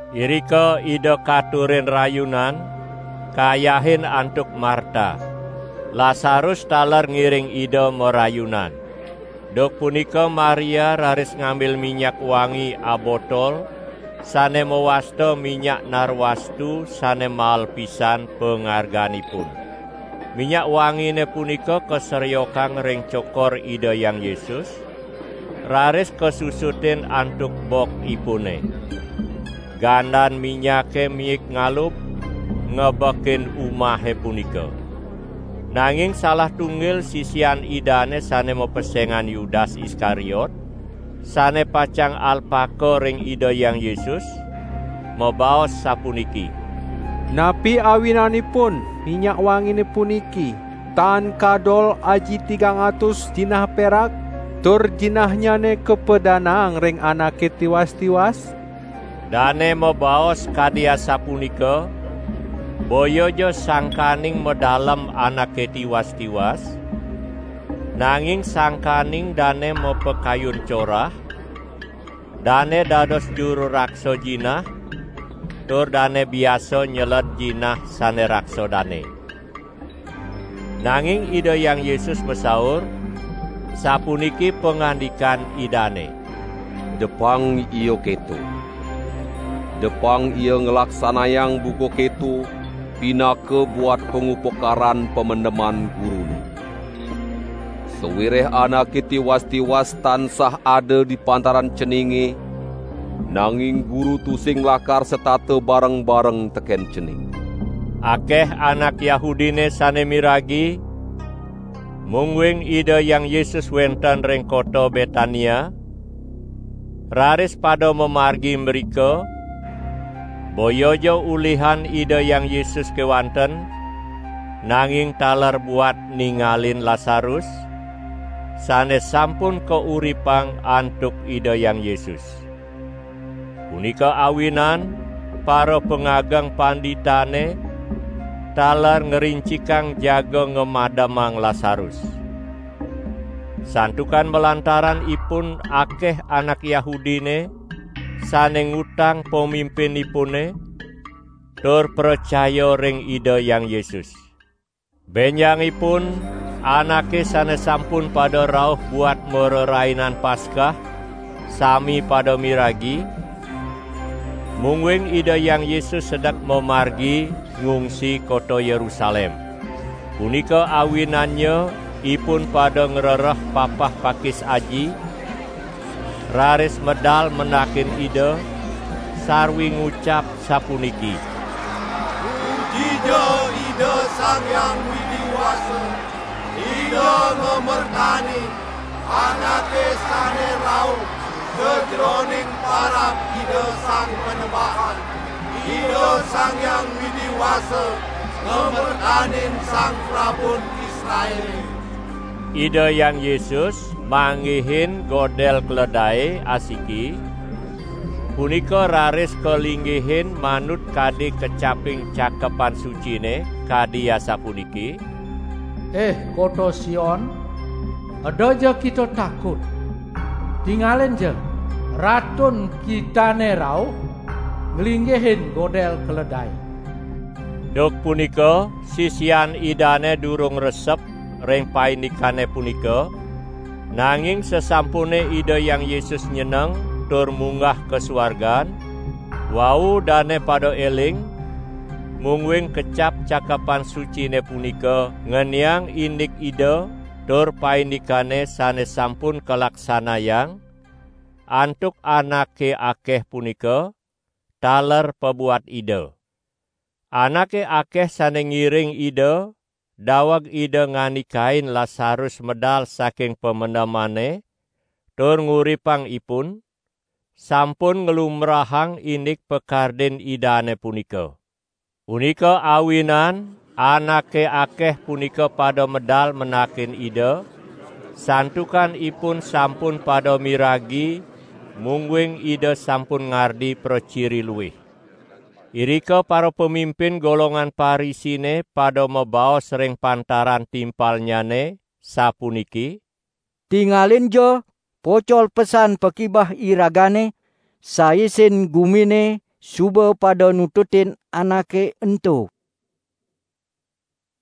Irika Ida katurin rayunan, kayahin antuk Marta. Lasarus taler ngiring Ida marayunan. Duk punika Maria raris ngambil minyak wangi abotol sane mawasta minyak narwastu sane mael pisan pangarganipun. Minyak wangine punika kasreokang ring cokor Ida Hyang Yesus, raris kasusutin antuk bokipune. Gandan minyake miik ngalub ngebekin umahe punika. Nanging salah tunggil sisian Idane sane mapesengan Yudas Iskariot, sane pacang alpaka ring Ida Hyang Yesus, mabaos sapuniki: "Napi awinanipun minyak wangine puniki tan kadol aji tigang atus jinah perak tur jinahnyane kapadanaang ring anake tiwas-tiwas?" Dane mabaos kadi asapunika boyaja sangkaning madalem anake tiwas-tiwas, nanging sangkaning dane mapakayun corah; dane dados juru raksa jinah tur dane biasa nyeled jinah sane raksa dane. Nanging Ida Hyang Yesus masaur, sapuniki pangandikan Idane: "Depang ia keto! Depang ia nglaksanayang buka keto pinaka buat pangupakaran pamendeman Gurune. Sawireh anake tiwas-tiwas tansah ada di pantaran ceninge, nanging Guru tusing lakar setata bareng-bareng teken cening." Akeh anak Yahudine sane miragi, mungguing Ida Hyang Yesus wenten ring kota Betania; raris pada mamargi mrika; boyaja ulihan Ida Hyang Yesus kewanten, nanging taler buat ningalin Lasarus, sane sampun kauripang antuk Ida Hyang Yesus. Punika awinan parapangageng panditane taler ngrincikang jaga ngamademang Lasarus. Santukan malantaran ipun akeh anak Yahudine sane ngutang pamimpinipune, tur pracaya ring Ida Hyang Yesus. Benjangipun anake sane sampun pada rauh buat marerainan Paskah sami pada miragi, mungguing Ida Hyang Yesus sedek mamargi ngungsi kota Yerusalem. Punika awinannya ipun pada ngrereh papah pakis aji, raris medal mendakin Ida, sarwi ngucap sapuniki: "Pujija Ida Sang Hyang Widi Wasa! Ida ngamertanin Anake sane rauh sajeroning parab Ida Sang Panembahan! Ida Sang Hyang Widi Wasa ngamertanin Sang Prabun Israele." Ida Hyang Yesus nyingak godel jaran asiki, punika raris kalinggihin manut kadi kacaping Cakepan Sucine kadi asapuniki: "Ih kota Sion, edaja kita takut! Tingalinja, Ratun kitane rauh nglinggihin godel keledae!" Duk punika sisian Idane durung resep ring paindikane punika; nanging sasampune Ida Hyang Yesus nyeneng tur munggah ka suargan, wau dane pada eling, mungguing kecap Cakepan Sucine punika ngeniang indik Ida tur paindikane sane sampun kalaksanayang antuk anake akeh punika taler pabuat Ida. Anake akeh sane ngiring Ida daweg Ida ngandikain Lasarus medal saking pamendemane tur nguripang ipun, sampun nglumbrahang indik pakardin Idane punika. Punika awinan anake akeh punika pada medal mendakin Ida, santukan ipun sampun pada miragi mungguing Ida sampun ngardi praciri luih. Irika parapamimpin golongan Parisine pada mabaos ring pantaran timpalnyane sapuniki: "Tingalinja! Pocol pesan pakibeh iragane! Saisin gumine suba pada nututin Anake ento!"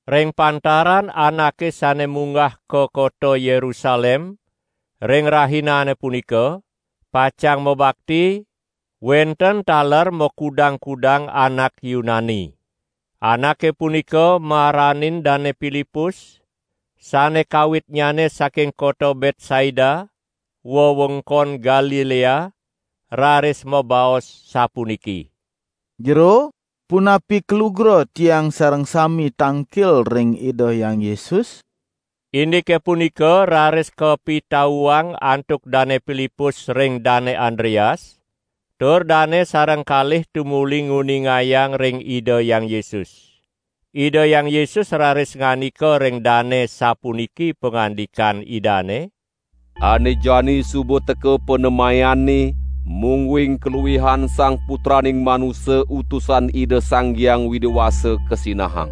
Ring pantaran anake sane munggah ka kota Yerusalem ring rahinane punika, pacang mabakti, wenten taler makudang-kudang anak Yunani. Anake punika maranin Dane Pilipus (sane kawitnyane saking kota Betsaida, wewengkon Galilea) raris mabaos sapuniki: "Jero, punapi kalugra, tiang sareng sami tangkil ring Ida Hyang Yesus?" Indike punika raris kapitauang antuk Dane Pilipus ring Dane Andreas, tur dane sareng kalih tumuli nguningayang ring Ida Hyang Yesus. Ida Hyang Yesus raris ngandika ring dane sapuniki pangandikan Idane: "Ane jani suba teka panemayanne mungguing kaluihan Sang Putraning Manusa Utusan Ida Sang Hyang Widi Wasa kasinahang.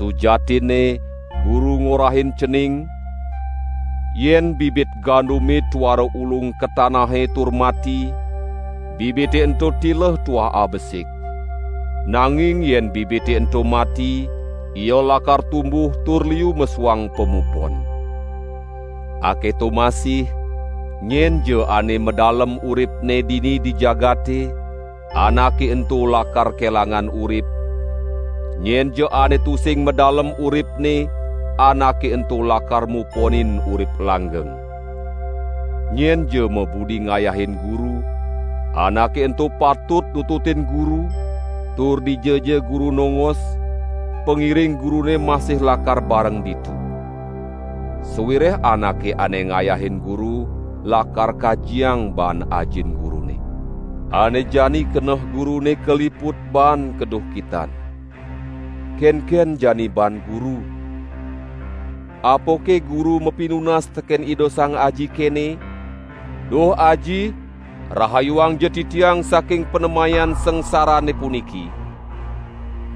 Sujatinne Guru ngorahin cening: Yen bibit gandume tuara ulung ka tanahe tur mati, bibite ento tileh tuah abesik. Nanging yen bibite ento mati, ia lakar tumbuh tur liu mesuang pamupon! Aketo masih nyenja ane madalem uripne dini di jagate, anake ento lakar kelangan urip, nyenja ane tusing madalem uripne, anake ento lakar muponin urip langgeng. Nyenja mabudi ngayahin Guru, anake ento patut nututin Guru, tur dijaja Guru nongos, pangiring Gurune masih lakar bareng ditu. Sawireh anake ane ngayahin Guru lakar kajiang baan Ajin Gurune." "Ane jani keneh Gurune kaliput baan kaduhkitan. Kenken jani baan Guru? Apake Guru mapinunas teken Ida Sang Aji kene: 'Duh Aji, rahayuangja Titiang saking panemayan sangsarane puniki!',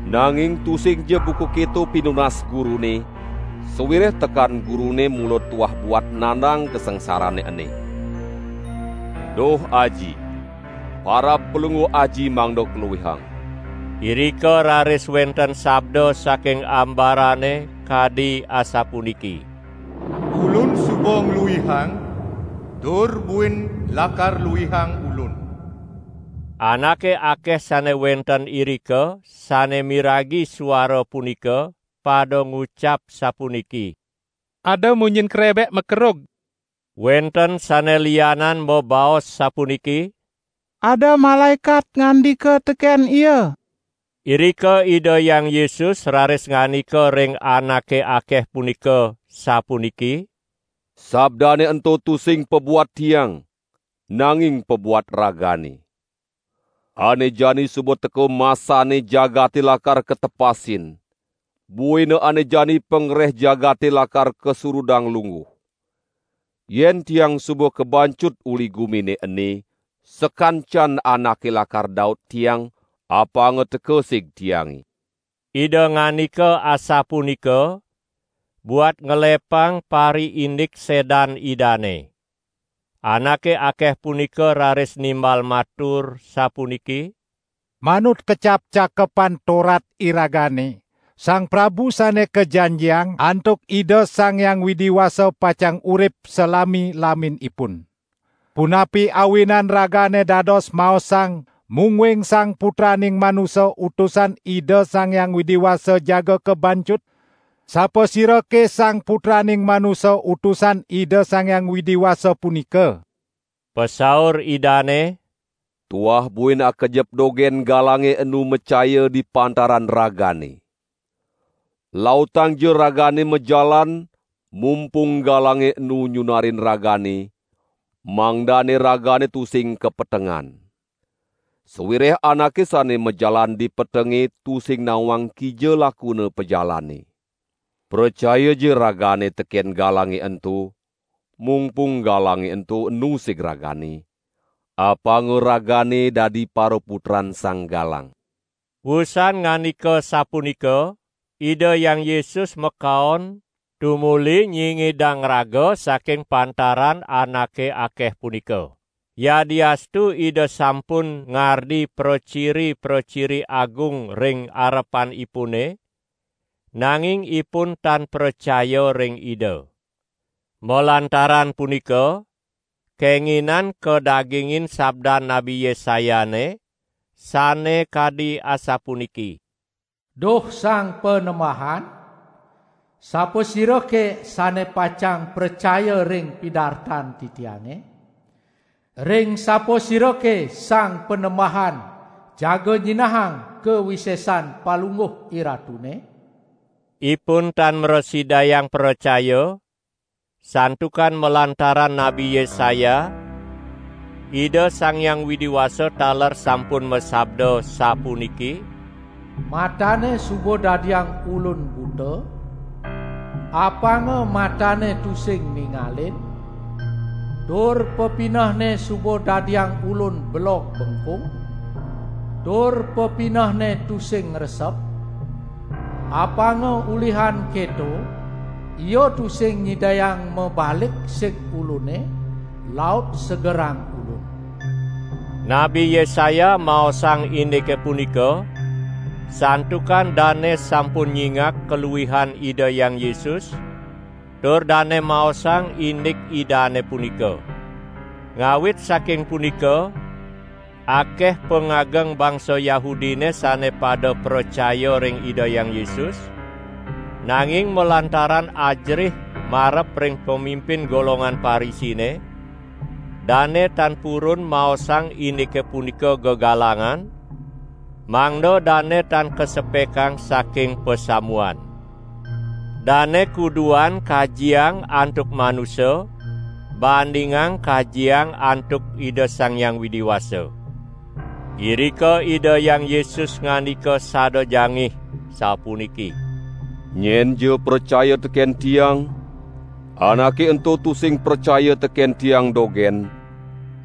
nanging tusingja buka keto pinunas Gurune sawireh tekan Gurune mula tuah buat nandang kasangsarane ene! Duh Aji, parab Palungguh Aji mangda kaluihang!" Irika raris wenten sabda saking ambarane kadi asapuniki: "Ulun suba ngluihang, tur buin lakar luihang Ulun!" Anake akeh sane wenten irika sane miragi suara punika pada ngucap sapuniki: "Ada munyin krebek makerug!" Wenten sane lianan mabaos sapuniki: "Ada malaekat ngandika teken Ia!" Irika Ida Hyang Yesus raris ngandika ring anake akeh punika sapuniki: "Sabdane ento tusing pabuat Tiang, nanging pabuat ragane. Ane jani suba teka masanne jagate lakar katepasin; buina ane jani pangreh jagate lakar kasurudang lungguh. Yen Tiang suba kabancut uli gumine ene, sakancan anake lakar daut Tiang, apanga teka sig Tiange." ( Ida ngandika asapunika buat ngelepang pariindik sedan Idane.) Anake akeh punika raris nimbal matur sapuniki: "Manut kecap Cakepan Torat iragane, Sang Prabu Sane Kajanjiang antuk Ida Sang Hyang Widi Wasa pacang urip salami-laminipun. Punapi awinan Ragane dados maosang mungguing Sang Putraning Manusa Utusan Ida Sang Hyang Widi Wasa jaga kabancut? Sapasirake Sang Putraning Manusa Utusan Ida Sang Hyang Widi Wasa punika?" Pasaur Idane: "Tuah buin akejep dogen galange enu macaya di pantaran ragane. Lautangja ragane majalan mungpung galange enu nyunarin ragane, mangdane ragane tusing kapetengan; sawireh anake ane majalan di petenge tusing nawang kija lakuna pajalanne. Pracayaja ragane teken galange ento, mungpung galange ento enu sig ragane, apanga ragane dadi paraputran Sang Galang." Wusan ngandika sapunika, Ida Hyang Yesus makaon, tumuli nyingidang raga saking pantaran anake akeh punika. Yadiastu Ida sampun ngardi praciri-praciri agung ring arepanipune, nanging ipun tan pracaya ring Ida. Malantaran punika kenginan kadagingin sabdan Nabi Yesayane sane kadi asapuniki: "Duh Sang Panembahan, sapasirake sane pacang pracaya ring pidartan titiange? Ring sapasirake Sang Panembahan jaga nyinahang kawisesan Palungguh IRatune?" Ipun tan mrasidayang pracaya, santukan malantaran Nabi Yesaya, Ida Sang Hyang Widi Wasa taler sampun masabda sapuniki: "Matanne suba dadiang Ulun buta, apanga matanne tusing ningalin, tur pepinehne suba dadiang Ulun belog bengkung, tur pepinehne tusing ngresep, apanga ulihan keto ia tusing nyidayang mabalik sig Ulune laut segerang Ulun." Nabi Yesaya maosang indike punika, santukan dane sampun nyingak kaluihan Ida Hyang Yesus tur dane maosang indik Idane punika. Ngawit saking punika, akeh pangageng bangsa Yahudine sane pada pracaya ring Ida Hyang Yesus; nanging malantaran ajerih marep ring pamimpin golongan Parisine dane tan purun maosang indike punika gegalangan, mangda dane tan kasepekang saking pasamuan. Dane kuduan kajiang antuk manusa, bandingang kajiang antuk Ida Sang Hyang Widi Wasa. Irika Ida Hyang Yesus ngandika sada jangih sapuniki: "Nyenja pracaya teken Tiang, anake ento tusing pracaya teken Tiang dogen,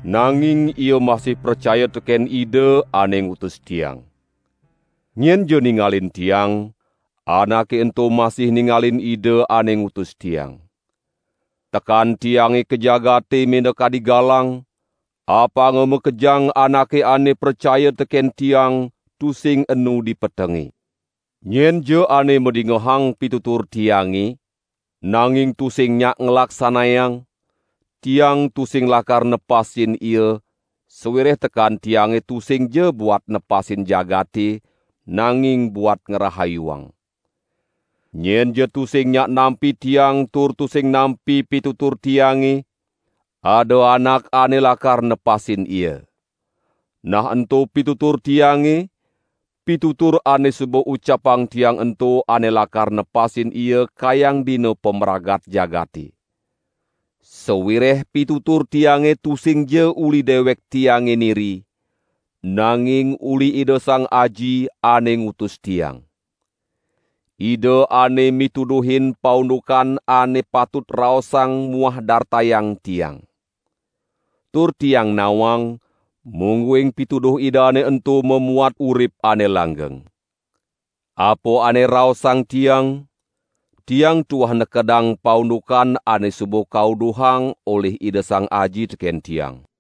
nanging ia masih pracaya teken Ida ane ngutus Tiang. Nyenja ningalin Tiang, anake ento masih ningalin Ida ane ngutus Tiang. Tekan Tiange ka jagate minakadi galang, apanga makejang anake ane pracaya teken Tiang tusing enu di petenge. Nyenja ane madingehang pitutur Tiange, nanging tusing nyak nglaksanayang, Tiang tusing lakar nepasin ia sawireh tekan Tiange tusingja buat nepasin jagate, nanging buat ngrahayuang. Nyenja tusing nyak nampi Tiang tur tusing nampi pitutur Tiange, ada anak ane lakar nepasin ia. Nah ento pitutur Tiange, pitutur ane suba ucapang Tiang ento ane lakar nepasin ia kayang dina pamragat jagate. Sawireh pitutur Tiange tusingja uli dewek Tiange niri, nanging uli Ida Sang Aji, ane ngutus Tiang. Ida ane mituduhin paundukan ane patut raosang muah dartayang Tiang. Tur Tiang nawang, mungguing pituduh Idane ento mamuat urip ane langgeng. Apa ane raosang Tiang, Tiang tuah nekedang paundukan ane suba kauduhang olih Ida Sang Aji teken Tiang."